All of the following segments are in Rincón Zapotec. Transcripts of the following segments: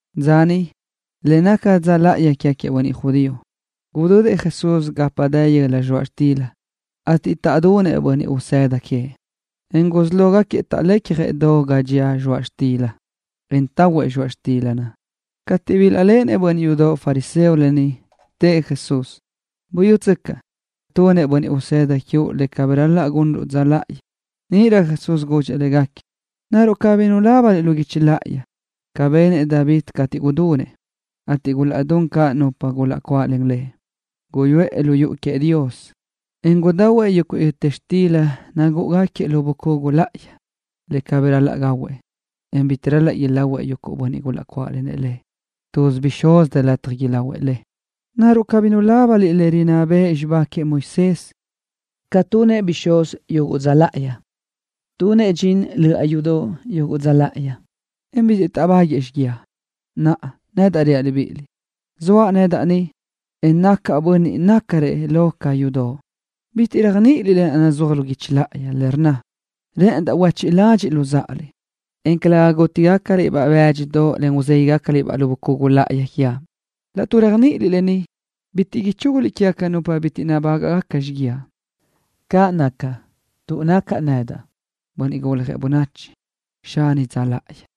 Dza niʼ, le naca dza láʼayi quégaquiëʼ bönniʼ judío, gudödëʼ Jesús gapa dë yöla zxoaʼ xtila, ateʼ taʼdunëʼ bönniʼ usëda queëʼ, en gusí lógaquiëʼ taʼlecjëʼ do ga dxía zxoaʼ xtila, en tahuëʼ zxoaʼ xtila naʼ. Cateʼ bilaʼléʼenëʼ bönniʼ yudoʼ fariseo lë ni, tëʼ Jesús: —Buyútsöcaʼ, tunëʼ bönniʼ usëda quiuʼ le cabí ral-laʼ gunruʼ dza láʼayi. Níʼirö Jesús gudxëʼ légaquiëʼ: —¿Naruʼ cabí nulábaniliʼ lu guichi láʼayi bi benëʼ David cateʼ gudunëʼ, ateʼ gulaʼdún caʼ nupa gulaʼcuáʼlen lëʼ? Guyuʼë lu yuʼu queëʼ Dios, en gudahuëʼ yuguʼ yöta xtila nagúʼugaquiëʼ lu bucugu láʼayi, le cabí ral-laʼ gahuëʼ lëʼ, en bitiʼ ral-laʼ ilahuëʼ bönniʼ gulaʼcuáʼlenëʼ lëʼ, pero légacsëʼ bixúz dë lataj ilahuëʼ le. ¿Naruʼ cabí nulábaniliʼ le rinná bëʼ xibá queëʼ Moisés ca tunëʼ bixúz yuguʼ dza láʼayi? Tunëʼ dxin löʼa yudoʼ yuguʼ dza láʼayi, en bitiʼ taʼbáguëʼë xíguiaʼ. Naʼa, nedaʼ reaʼ libíʼiliʼ, zoaʼ nedaʼ ni, en nacaʼ bönniʼ nácarëʼ lo ca yudoʼ. Bitiʼ réajniʼiliʼ lë naʼ nazúaj lu guichi láʼayi, le rnna: “Rë́ʼëndaʼ huéchiʼ ládxiʼliʼ luzáʼaliʼ, en calëga gútigacaliʼ-baʼ böaʼ bë́dxidoʼ ruzéguiʼgacaliʼ-baʼ lu bucugu láʼayi quiaʼ.” Laʼtuʼ réajniʼiliʼ lë ni, bitiʼ ichúguliʼ quégaca nupa bitiʼ nabágaʼgaca xíguiaʼ. Caʼ naca, tuʼ nacaʼ nedaʼ, Bönniʼ Guljëʼ Bönachi, Xani dza láʼayi.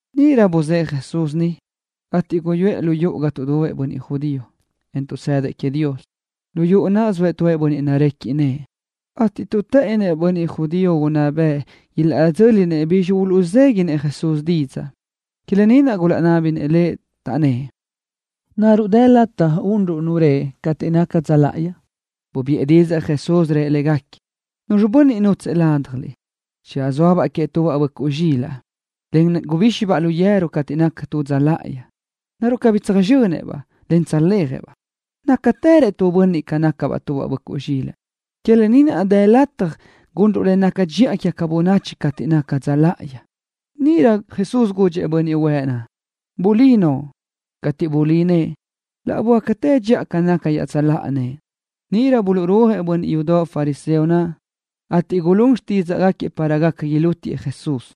Níʼirö buzë́ʼë Jesús niʼ, ateʼ guyuʼë lu yuʼu ga tuʼdubëʼ bönniʼ judío, en tuʼsëdëʼ queëʼ Dios. Lu yuʼu naʼ zoëʼ tu bönniʼ narequiʼ nëʼë, ateʼ tuʼ të́ʼënnëʼ bönniʼ judío unná bëʼ ilaʼdzö́linëʼ bi uluʼzéguiʼë Jesús didzaʼ, que lë ni naʼ gulaʼnábinëʼ Lëʼ, taʼnnë́ʼ: —¿Naruʼ dë lataj unruʼ nu reʼe cateʼ naca dza láʼayi? Bubiʼë didzaʼ Jesús, rëʼ légaquiëʼ: —Nu bönniʼ nútsëʼë ládjaliʼ, channö zóabaʼ tubaʼ böʼcuʼ zxilaʼ queëʼ, en channö ibíxibaʼ lu yeru cateʼ naca dza láʼayi, ¿naruʼ cabí tsöjxönëʼ-baʼ, en tsöjléajëʼ-baʼ? Nazácaʼtërëʼ tu bönniʼ ca tubaʼ böʼcuʼ zxilaʼ. Que lë ni naʼ, dë lataj gunruʼ le naca dxiʼa quégaca bönachi cateʼ naca dza láʼayi. Níʼirö Jesús gudxëʼ bönniʼ huëʼ naʼ: —Bulí noʼo. Cateʼ bulí nëʼë, laʼ böácatë dxiʼa ca naca iaʼtsöláʼa nëʼë. Níʼirö buluʼrúajëʼ bönniʼ yudoʼ fariseo naʼ, ateʼ gulún xtídzaʼgaquiëʼ para gaca ilútiëʼ Jesús.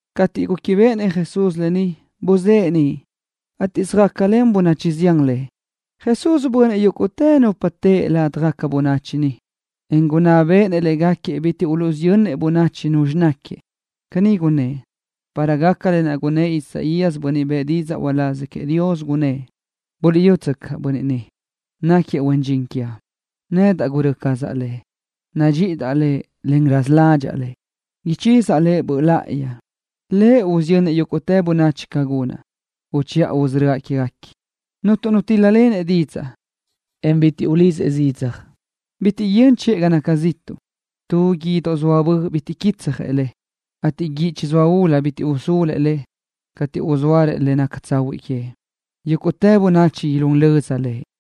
Cateʼ réquibeʼenëʼ Jesús lë ni, buzë́ʼë niʼ, ateʼ söjácalen bönachi zián Lëʼ. Jesús bunëʼ yúguʼtë nupa teʼe ladaj bönachi naʼ, en gunná béʼenëʼ léguequi bitiʼ usiyö́nguequi bönachi Nu náquiëʼ. Caní gunnë́ʼ, para gaca lë naʼ gunnë́ʼ Isaías, bönniʼ bëʼë didzaʼ uláz queëʼ Dios, gunnë́ʼ: Buliʼyútsöcaʼ, Bönniʼ ni náquiëʼ Huen Dxin quiaʼ, naʼ gurö́ cazaʼ nedaʼ Lëʼ. Nadxíʼidaʼ Lëʼ, en raza ládxaʼa Lëʼ. Ichizaʼ Lëʼ Böʼ Láʼayi. Lëʼ usiyönnëʼ yúguʼtë bönachi ca gunaʼ, uchiʼa usörö́aʼ quéguequi. Cuntu nu tíl-lalenëʼ didzaʼ, en bitiʼ ulidzëʼ zidzaj. Cuntu nu yöni chiʼë ga naca ziʼtuʼ. Tu guídoʼ zoa bö bitiʼ quitsjëʼ le, ateʼ guíʼ chizóa ulu, bitiʼ usúluëʼ le, cateʼ uzóarëʼ le naca tsahuiʼ queëʼ. Yúguʼtë bönachi ilún löza Lëʼ.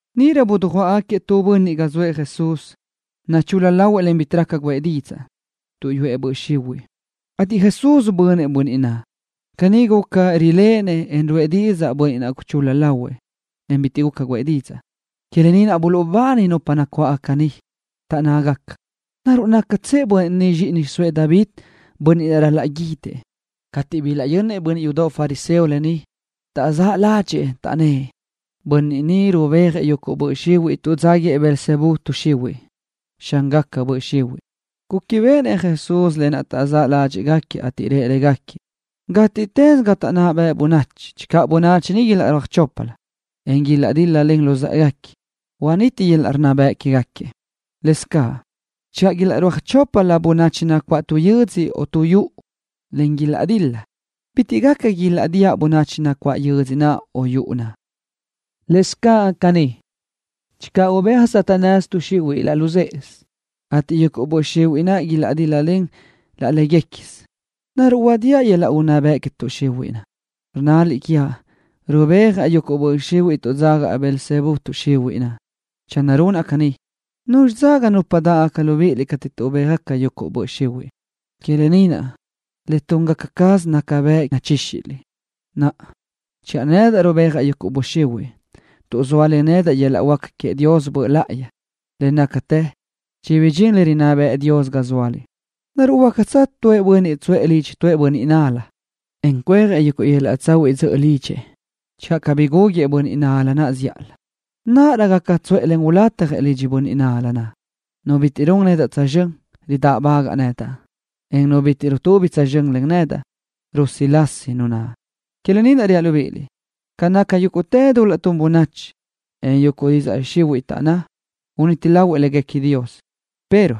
Níʼirö dujuáʼgaquiëʼ tu bönniʼ ga zoëʼ Jesús, nachul-la lahuëʼ, en bitiʼ raca guʼë didzaʼ, tuʼ yuʼu böʼ xihuiʼ lëʼ, ateʼ Jesús bunëʼ bönniʼ naʼ. Caní guca, riléʼenëʼ, en ruʼë didzaʼ bönniʼ naʼ guchul-la lahuëʼ, en bitiʼ guca guʼë didzaʼ. Que lë ni naʼ buluʼbani yúguʼtë bönachi nacuáʼ niʼ, taʼnná: —¿Naruʼ nácatsëʼ bönniʼ ni Zxíʼini Xiʼsóëʼ David, Bönniʼ naʼ ral-laʼ guídëʼ? Cateʼ bilaʼyönnëʼ bönniʼ yudoʼ fariseo lë ni, taʼzáʼ ládxëʼë, taʼnnë́ʼ: Bönniʼ ni rubéajëʼ yuguʼ böʼ xihuiʼ tuʼ dzaga Beelzebú tuʼ xihuiʼ, xángaca böʼ xihuiʼ, Lëʼ. Réquibeʼenëʼ Jesús lë naʼ taʼzáʼ ládxiʼgaquiëʼ, ateʼ rëʼ légaquiëʼ: —Gátiʼtës ga taʼnná bëʼ bönachi, channö bönachi niʼ ilaʼrúaj choplö, en ilaʼdíl-lalen luzë́ʼeguequi, initi yöl-laʼ unná bëʼ quéguequi. Lëscaʼ caní, channö ilaʼrúaj choplö bönachi nacuáʼ tu yödzö o tu yuʼu, en ilaʼdil-la, bitiʼ gaca ilaʼdíaʼ bönachi nacuáʼ yödzö naʼ o yuʼu naʼ. Lëscaʼ caní, channö ubéaj Satanás tuʼ xihuiʼ laʼ luzë́ʼesö, ateʼ yuguʼ böʼ xihuiʼ naʼ ilaʼdíl-lalen laʼ léguequisö, ¿naruʼ idíaʼ yöl-laʼ unná bëʼ que tuʼ xihuiʼ? Rnnaliʼ quiaʼ rubéajaʼ yuguʼ böʼ xihuiʼ tuʼ dzaga Beelzebú tuʼ xihuiʼ nedaʼ. Channö runaʼ caní, ¿nuzxi dzaga nupa dáʼgaca libíʼiliʼ cateʼ tuʼbéaj yuguʼ böʼ xihuiʼ? Que lë ni naʼ le túngaca caz naca bëʼ nachíxiliʼ. Naʼa, channö nedaʼ rubéajaʼ yuguʼ böʼ xihuiʼ tuʼ zóalen yöl-laʼ huáca queëʼ Dios Böʼ Láʼayi nedaʼ, le nácatë chibidxín le rinná bëʼë Dios ga zóaliʼ. ’¿Naruʼ huácatsö nu bönniʼ tsuʼë lidxëʼ bönniʼ nal-la, en cuéajëʼ yöl-laʼ tsahuiʼ dzöʼö lidxëʼ channö cabí gúguëʼë bönniʼ nal-la naʼ zíʼalö? Níʼirö gaca tsuʼë, en ulatjëʼ lidxëʼ bönniʼ nal-la naʼ. ’Nu bitiʼ run nedaʼ tsözxö́n, ridáʼbagaʼ nedaʼ, en nu bitiʼ rutubi tsözxö́n len nedaʼ, rusilasi nu naʼ. ’Que lë ni naʼ reaʼ libíʼiliʼ, ca naca yúguʼtë dul-laʼ tun bönachi, en yuguʼ didzaʼ xihuiʼ taʼnná, uniti lahuëʼ Dios léguequi, pero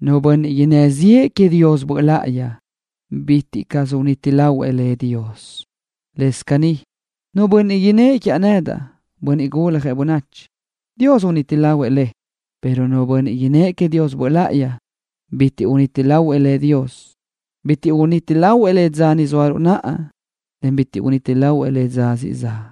nu bönniʼ innë́ ziʼë queëʼ Dios Böʼ Láʼayi, bitiʼ caʼ uniti lahuëʼ Dios lëʼ. Lëscaʼ caní, nu bönniʼ innë́ʼ quiaʼ nedaʼ, Bönniʼ Guljëʼ Bönachi, Dios uniti lahuëʼ lëʼ, pero nu bönniʼ innë́ʼ queëʼ Dios Böʼ Láʼayi, bitiʼ caʼ uniti lahuëʼ Dios lëʼ. Bitiʼ uniti lahuëʼ lëʼ dza ni zóaruʼ naʼa, en bitiʼ uniti lahuëʼ lëʼ dza siʼ zaʼ.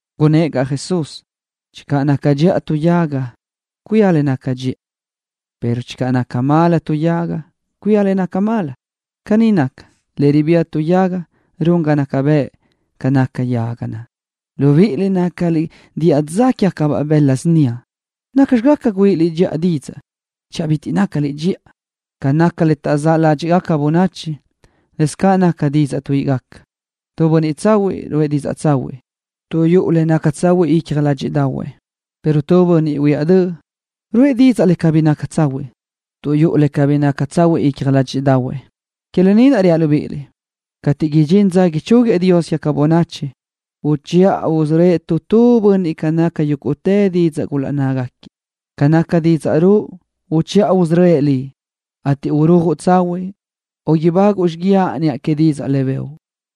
Gunnë́ʼ caʼ Jesús: —Channö naca dxiʼa tu yaga, cuía le naca dxiʼa, pero channö naca cáʼasö yaga naʼ, cuía caʼ le naca cáʼasö. Caní naca, le ribía tu yaga naca bëʼ yaga naʼ. Libíʼiliʼ nácaliʼ diʼa dza quégacabaʼ bëla síniaʼ. ¿Nacxi gaca güíʼiliʼ dxiʼa didzaʼ, channö cabí nácaliʼ dxiʼa? Ca naca le taʼzáʼ ládxiʼgaca bönachi, lëscaʼ caní tuíʼi didzaʼ. Tu bönniʼ tsahuiʼ ruʼë didzaʼ tsahuiʼ tuʼ yuʼu le naca tsahuiʼ icja ládxiʼdaʼahuëʼ, pero tu bönniʼ huiáʼ döʼ ruʼë didzaʼ bitiʼ naca tsahuiʼ tuʼ yuʼu le cabí naca tsahuiʼ icja ládxiʼdaʼahuëʼ. Que lë ni naʼ reaʼ libíʼiliʼ, cateʼ idxín dza ichúguiëʼ Dios quégaca bönachi, uchiʼa usörö́ëʼ tu tu bönniʼ ca naca yúguʼtë didzaʼ gulaʼnnazëʼ caʼ. Ca naca didzaʼ ruʼu, uchiʼa usörö́ëʼ liʼ, ateʼ urujuʼ tsahuiʼ o ibáguʼu xíguiaʼ niʼa que didzaʼ naʼ bëʼu.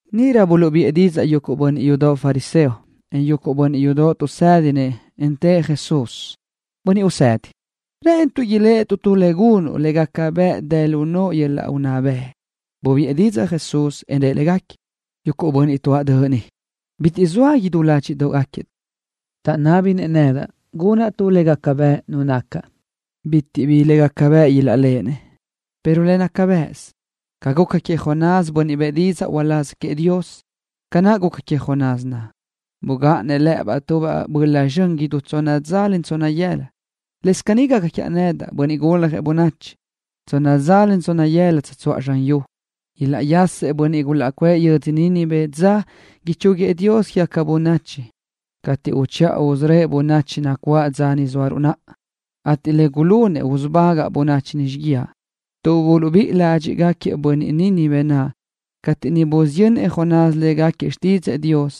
Níʼirö buluʼbiʼë didzaʼ yuguʼ bönniʼ yudoʼ fariseo, en yuguʼ bönniʼ yudoʼ tuʼsédinëʼ, en tëʼ Jesús: —Bönniʼ Usedi, rë́ʼënituʼ iléʼetuʼ tu le gunuʼ le gaca bëʼ dë lu noʼo yöl-laʼ unná bëʼ. Bubiʼë didzaʼ Jesús, en rëʼ légaquiëʼ: —Yuguʼ bönniʼ tuáʼ döʼ ni, bitiʼ zoa idú ládxiʼdoʼgaquiëʼ, taʼnábinëʼ nedaʼ gunaʼ tu le gaca bëʼ nu nacaʼ. Bitiʼ bi le gaca bëʼ ilaʼléʼenëʼ, pero le naca bëʼsö naʼ ca guca queëʼ Jonás, bönniʼ bëʼë didzaʼ uláz queëʼ Dios. Ca naʼ guca queëʼ Jonás naʼ, bugáʼanëʼ lë́ʼëbaʼ tu böla zxön idú tsonna dza tsonna yëla, lëscaʼ caní gaca quiaʼ nedaʼ, Bönniʼ Guljëʼ Bönachi, tsonna dza tsonna yëla ugáʼanaʼ zxan yu. Ilaʼyasëʼ bönniʼ gulaʼcuʼë yödzö Nínive dza ichúguiëʼ Dios quégaca bönachi cateʼ uchiʼa usörö́ëʼ bönachi nacuáʼ dza ni zóaruʼ naʼa, ateʼ le gulunëʼ usubagaʼ bönachi ni xíguiaʼ tuʼ buluʼbíʼi ládxiʼgaquiëʼ bönniʼ Nínive naʼ cateʼ niʼ busiyönnëʼ Jonás légaquiëʼ xtídzëʼë Dios,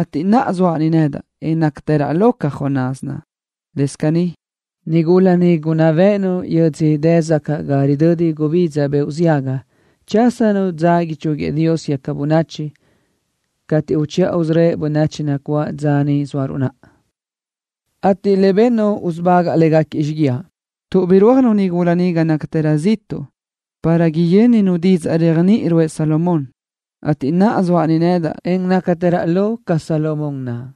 ateʼ naʼa zoaʼ ni nedaʼ, en nácatëraʼ lo ca Jonás naʼ. Lëscaʼ caní, nigula niʼ gunná béʼenu yödzö dë sacaʼ ga ridödi gubidza beoʼ ziaga chásanu dza ichúguiëʼ Dios quégaca bönachi cateʼ uchiʼa usörö́ëʼ bönachi nacuáʼ dza ni zóaruʼ naʼa, ateʼ le bennu usubagaʼ légaquiëʼ xíguiaʼ, tuʼ birúajnu nigula naʼ ga nácatërö ziʼtuʼ para yö́ninu didzaʼ réajniʼi bëʼë Salomón, ateʼ naʼa zoaʼ ni nedaʼ, en nácatëraʼ lo ca Salomón naʼ.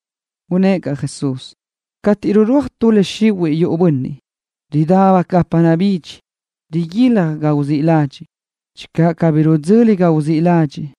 Gunnë́ʼ caʼ Jesús: —Cateʼ rirúaj tu böʼ xihuiʼ yuʼu bönniʼ, ridá gapa nabidxi, riguilaj ga uzíʼ ladxiʼ. Channö cabí idzöli ga naʼ uzíʼ ladxiʼ,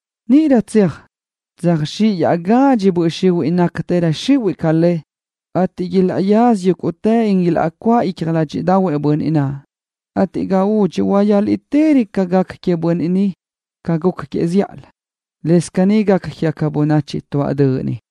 Níʼirö tseaj, tsöjzxíʼ iaʼgadxi böʼ xihuiʼ nácagacatërö xihuiʼ ca le, ateʼ ilaʼyaza yúguʼtë, en ilaʼcuáʼ icja ládxidaʼahuëʼ bönniʼ naʼ, ateʼ ga údxi huayáliʼtërö ca gaca queëʼ bönniʼ naʼ ca guca queëʼ zíʼalö. Lëscaʼ caní gaca quégaca bönachi tuáʼ döʼ ni.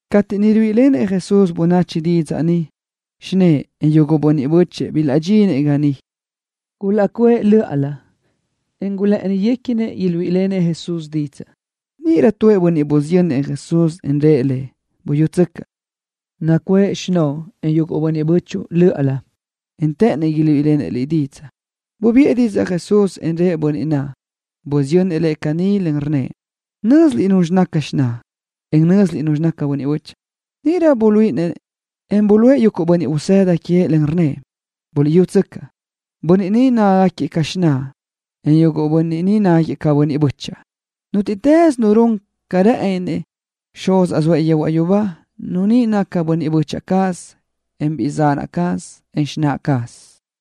Cateʼ niʼ ruíʼilenëʼ Jesús bönachi didzaʼ ni, xinë́ʼë, en yuguʼ bönniʼ bö́chëʼë bilaʼdxinëʼ niʼ. Gulaʼcuʼë lö́ʼalö, en gulë́ʼëniguequinëʼ iluíʼilenëʼ Jesús didzaʼ. Níʼirö tu bönniʼ busiyönnëʼ Jesús, en rëʼ Lëʼ: —Buyútsöcaʼ, nacuʼë xinóʼo, en yuguʼ bönniʼ bö́chuʼu lö́ʼalö, en të́ʼënnëʼ iluíʼilenëʼ Liʼ didzaʼ. Bubiʼë didzaʼ Jesús, en rëʼ bönniʼ naʼ busiyönnëʼ Lëʼ caní, rnnëʼ: —¿Nö́ziliʼ nuzxi caz xináʼa, en nupxi caz bönniʼ bö́chaʼa? Níʼirö bulí nëʼë, en buluʼe yuguʼ bönniʼ usëda queëʼ, en rnnëʼ: —Buliʼyútsöcaʼ, bönniʼ ni nácagaquiëʼ ca xináʼ cazaʼ, en yuguʼ böchiʼ cazaʼ. Nútiʼtës nu run ca rë́ʼëni quézinëʼ Xuzaʼ zoëʼ yehuaʼ yubá, nu ni naca biʼi böchiʼ cazaʼ, en biʼi zan cazaʼ, en xináʼ cazaʼ.